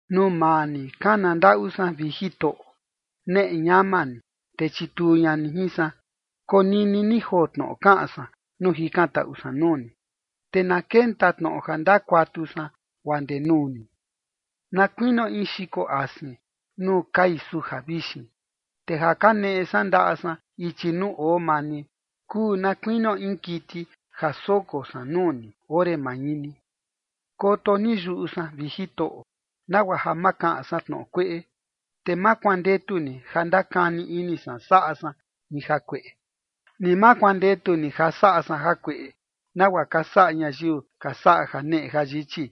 Nuu maa ni kana ndaꞌu san, vi Jitoꞌo. Neꞌe ñama ni, te chituu ña ni jin san. Konini ni joo tnoꞌo kaꞌan san nuu jikantaꞌu san nuu ni. Te na kenta tnoꞌo ja ndakuatu san guaa ndee nuu ni, na kuinio in xiko asin nuu kai suja vixin. Te ja kaneꞌe san ndaꞌa san ichi nuu oo maa ni, kuu na kuinio in kiti ja soko san nuu ni ore mañini. Koto ni yuꞌu san, vi Jitoꞌo, nagua ja ma kaꞌan san tnoꞌo kueꞌe. Te ma kuandetu ni ja ndakani ini san saꞌa san in jakueꞌe, ni ma kuandetu ni ja saꞌa san jakueꞌe, nagua ka saꞌa ñayiu ka saꞌa janeꞌe jayichi,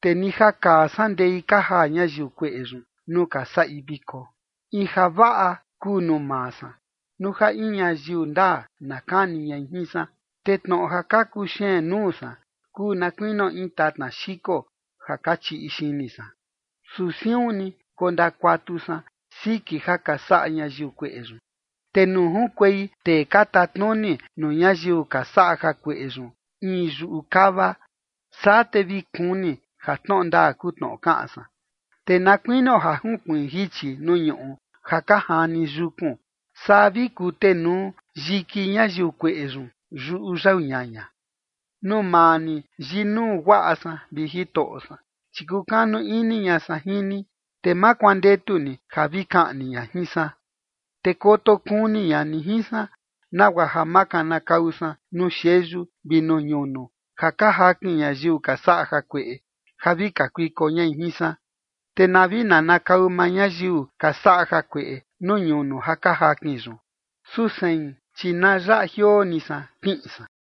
te ni ja kaa san ndei ka jaa ñayiu kueꞌe yun nuu ka saꞌi viko. In javaꞌa kuu nuu maa san, nuu ja in ñayiu ndaa na kani ñai jin san, te tnoꞌo ja ka kuxeen nuu san kuu na kuinio in tatna xiko ja ka chiꞌi xini san. Su siun ni kondakuatu san siki ja ka saꞌa ñayiu kueꞌe yun. Te nuu junkuei tee ka tatnuni nuu ñayiu ka saꞌa jakueꞌe yun in yuꞌu kava, saa te vi kuni ja tnoꞌo ndaa kuu tnoꞌo kaꞌan san. Te na kuinio ja junkuiin jichi nuu ñuꞌu ja ka jani yukun, saa vi kutenuu yiki ñayiu kueꞌe yun yuꞌu yau ñaña. Nuu maa ni yinuu guaꞌa san, vi Jitoꞌo san, chi kukanu ini ña san jin ni, te ma kuandetu ni ja vi kaꞌni ña jin san. Te koto kuni ña ni jin san, nagua ja ma kanakau san nuu xeyu vi nuu ñunu ja ka jakin ñayiu ka saꞌa jakueꞌe, ja vi kakuiko ña jin san. Te na vi nanakau maa ñayiu ka saꞌa jakueꞌe nuu ñunu ja ka jakin yun. Su sein, chi na yaꞌa jioo ni san, kiꞌin san.